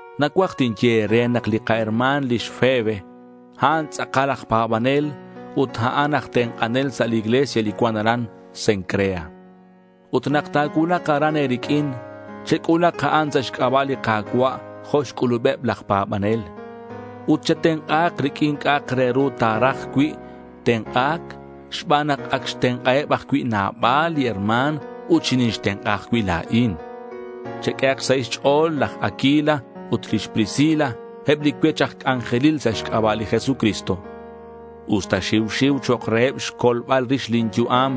Nacuaj tinye e̱re nak li kaherma̱n lix Febe, a'an tz'akal aj pa̱banel ut a'an aj tenk'anel sa' li iglesia li cuan aran Cencrea. Ut nak ta̱cuulak aran e̱riq'uin, chec'ulak a'an sa' xc'aba' li Ka̱cua' jo' xc'ulubeb laj pa̱banel. Ut chetenk'ahak riq'uin c'a'ak re ru ta̱raj cui' tenk'a̱c xban nak ac xtenk'aheb ajcui' nabal li herma̱n ut xinixtenk'a ajcui' la̱in. Cheq'uehak xsahil xch'o̱l laj Aquila ut lix Priscila, eb li cuech aj c'anjelil sa' xc'aba' li Jesucristo. Usta xiu xiu chok' reheb xcolbal rix lin yu'am,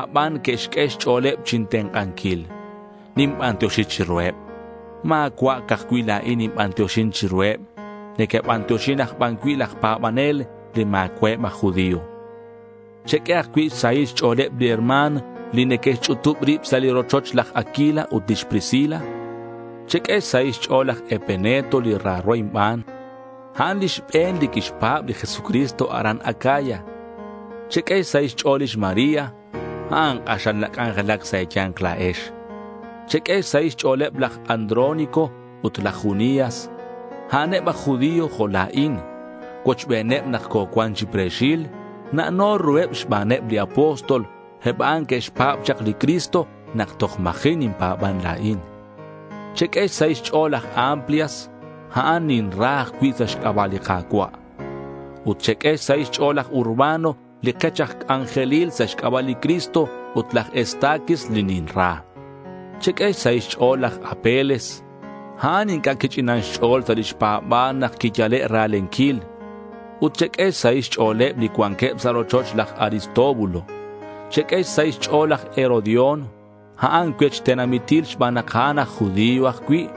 aban que'xq'ue xch'o̱leb chintenk'anquil. Ninbantioxi chiruheb. Ma̱cua' ca'aj cui' la̱in ninbantioxin chiruheb. Neque'bantioxin aj ban cui' laj pa̱banel li ma̱cua'eb aj judío. Cheq'ue ajcui' xsahil xch'o̱leb li herma̱n li neque'xch'utub rib sa' li rochoch laj Aquila ut lix Priscila. Cheq'ue xsahil xch'o̱l laj Epeneto, li raro inban. A'an li xbe̱n li quixpa̱b li Jesucristo aran Acaya. Cheq'ue xsahil xch'o̱l lix María. A'an k'axal nac'anjelac sa' e̱ya̱nk la̱ex. Cheq'ue xsahil xch'o̱leb laj Andrónico ut laj Junias. A'aneb aj judío jo' la̱in. Cuochbeneb nak cocuan chi pre̱xil. Na'no ruheb xbaneb li apóstol. Eb a'an que'xpa̱b chak li Cristo nak toj ma̱ji' ninpa̱ban la̱in. Cheq'ue xsahil xch'o̱l laj Amplias. A'an ninra ajcui' sa' xc'aba' li Ka̱cua'. Ut cheq'ue xsahil xch'o̱l laj Urbano li kech aj c'anjelil sa' xc'aba' li Cristo, ut laj Estaquis li ninra. Cheq'ue xsahil xch'o̱l laj Apeles. A'an inc'a' quich'inan xch'o̱l sa' lix pa̱ba̱l nak quiyale' ra̱lenquil. Ut cheq'ue xsahil xch'o̱leb li cuanqueb sa' rochoch laj Aristóbulo. Cheq'ue xsahil xch'o̱l laj Herodión. A'an cuech tenamitil xban nak a'an aj judío ajcui'.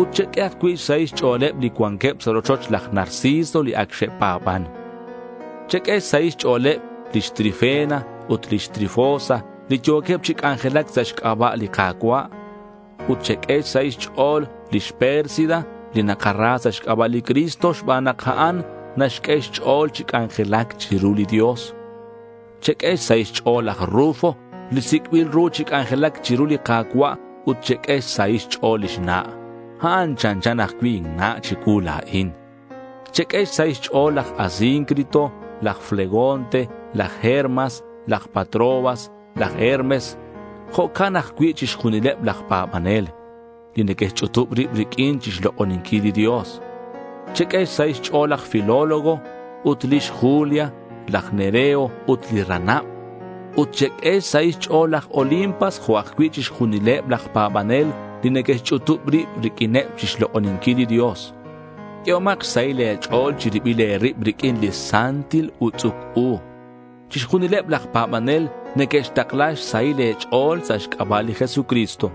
Ut cheq'ue ajcui' xsahil xch'o̱leb li cuanqueb sa' rochoch laj Narciso li ac xe'pa̱ban. Cheq'ue xsahil xch'o̱leb lix Trifena ut lix Trifosa li yo̱queb chi c'anjelac sa' xc'aba' li Ka̱cua'. Ut cheq'ue xsahil xch'o̱l lix Pérsida, li nakara sa' xc'aba' li Cristo xban nak a'an naxq'ue xch'o̱l chi c'anjelac chiru li Dios. Cheq'ue xsahil xch'o̱l laj Rufo, li sic'bil ru chi c'anjelac chiru li Ka̱cua', ut cheq'ue xsahil xch'o̱l lix na'. A'an chanchan ajcui' inna' chicuu la̱in. Cheq'ue xsahil xch'o̱l laj Asíncrito, laj Flegonte, laj Hermas, laj Patrobas, laj Hermes, jo'queb ajcui' chixjunileb laj pa̱banel, li neque'xch'utub rib riq'uineb chi xlok'oninquil li Dios. Cheq'ue xsahil xch'o̱l laj Filólogo ut lix Julia, laj Nereo ut li ranab. Ut cheq'ue xsahil xch'o̱l laj Olimpas jo' eb ajcui' chixjunileb laj pa̱banel li neque'xch'utub rib riq'uineb chixlok'oninquil li Dios. Q'uehomak xsahil e̱ch'o̱l chi ribil e̱rib riq'uin santil utz'uc u. Chixjunileb laj pa̱banel neque'xtakla xsahil e̱ch'o̱l sa' xc'aba' li Jesucristo.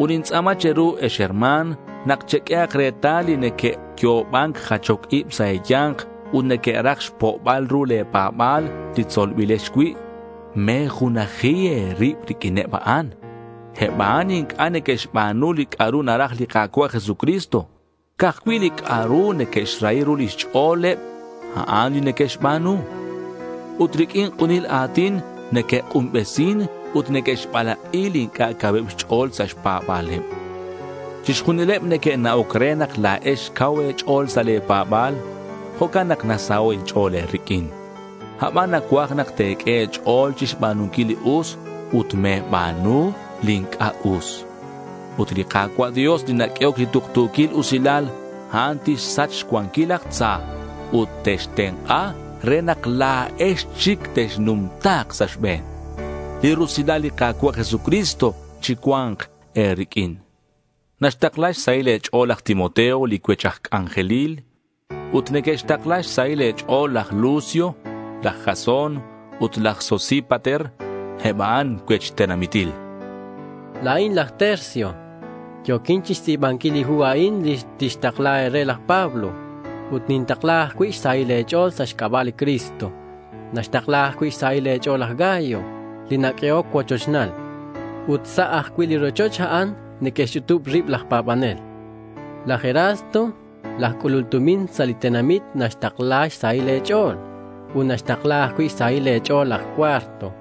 Ut nintz'a̱ma che̱ru, ex herma̱n, nak cheq'uehak retal li neque'yo'oban jachoc ib sa' e̱ya̱nk ut neque'raj xpo'bal ru le̱ pa̱ba̱l, li tzolbilex cui'. Me̱junaji e̱rib riq'uineb a'an. Eb a'an inc'a' neque'xba̱nu li c'a'ru naraj li Ka̱cua' Jesucristo. Ca'aj cui' li c'a'ru neque'xrahi ru lix ch'o̱leb, a'an li neque'xba̱nu. Ut riq'uin k'unil a̱tin neque'k'unbesin ut neque'xbalak'i li inc'a' cauheb xch'o̱l sa' xpa̱ba̱leb. Chixjunileb neque'na'oc re nak la̱ex cau e̱ch'o̱l sa' le̱ pa̱ba̱l. Jo'can nak nasaho' inch'o̱l e̱riq'uin. Aban nacuaj nak te̱q'ue e̱ch'o̱l chixba̱nunquil li us ut me̱ba̱nu li inc'a' us. Ut li Ka̱cua' Dios, li naq'uehoc li tuktu̱quil usilal, a'an tixsach xcuanquil laj tza ut textenk'a re nak la̱ex chic texnumta̱k sa' xbe̱n. Li rusilal li Ka̱cua' Jesucristo chicua̱nk e̱riq'uin. Naxtakla xsahil e̱ch'o̱l laj Timoteo, li cuech aj c'anjelil. Ut neque'xtakla xsahil e̱ch'o̱l laj Lucio, laj Jasón ut laj Sosípater. Eb a'an cuech tenamitil. La̱in laj Tercio. Yo̱quin chixtz'i̱banquil li hu a'in li tixtakla e̱re laj Pablo. Ut nintakla ajcui' xsahil e̱ch'o̱l sa' xc'aba' li Cristo. Naxtakla ajcui' xsahil e̱ch'o̱l laj Gayo, li naq'uehoc cuochochnal. Ut sa' ajcui' li rochoch a'an neque'xch'utub rib laj pa̱banel. Laj Erasto, laj c'ulul tumin sa' li tenamit, naxtakla xsahil e̱ch'o̱l. Ut naxtakla ajcui' xsahil e̱ch'o̱l laj Cuarto.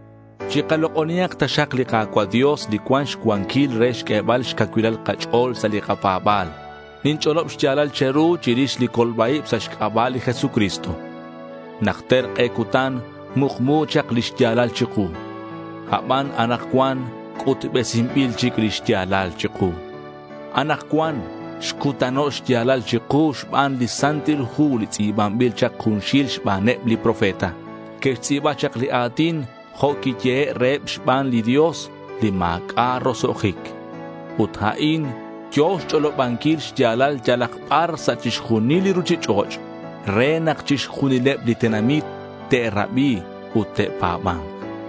Chikalok'onihak taxak li Ka̱cua' Dios, li cuan xcuanquil re xq'uebal xcacuilal kach'o̱l sa' li kapa̱ba̱l. Ninch'olob xya̱lal che̱ru chirix li colba-ib sa' xc'aba' li Jesucristo. Najter k'e cutan mukmu chak li xya̱lal chiku; aban anakcuan c'utbesinbil chic lix ya̱lal chiku. Anakcuan xcutano' xya̱lal chiku xban li Santil Hu li tz'i̱banbil chak junxil xbaneb li profeta. Que'xtz'i̱ba chak li a̱tin jo' quiyehe' reheb xban li Dios, li ma̱c'a' roso'jic. Ut a'in yo̱ xch'olobanquil xya̱lal yalak bar sa' chixjunil li ruchich'och' re nak chixjunileb li tenamit te'rabi ut te'pa̱ba̱nk.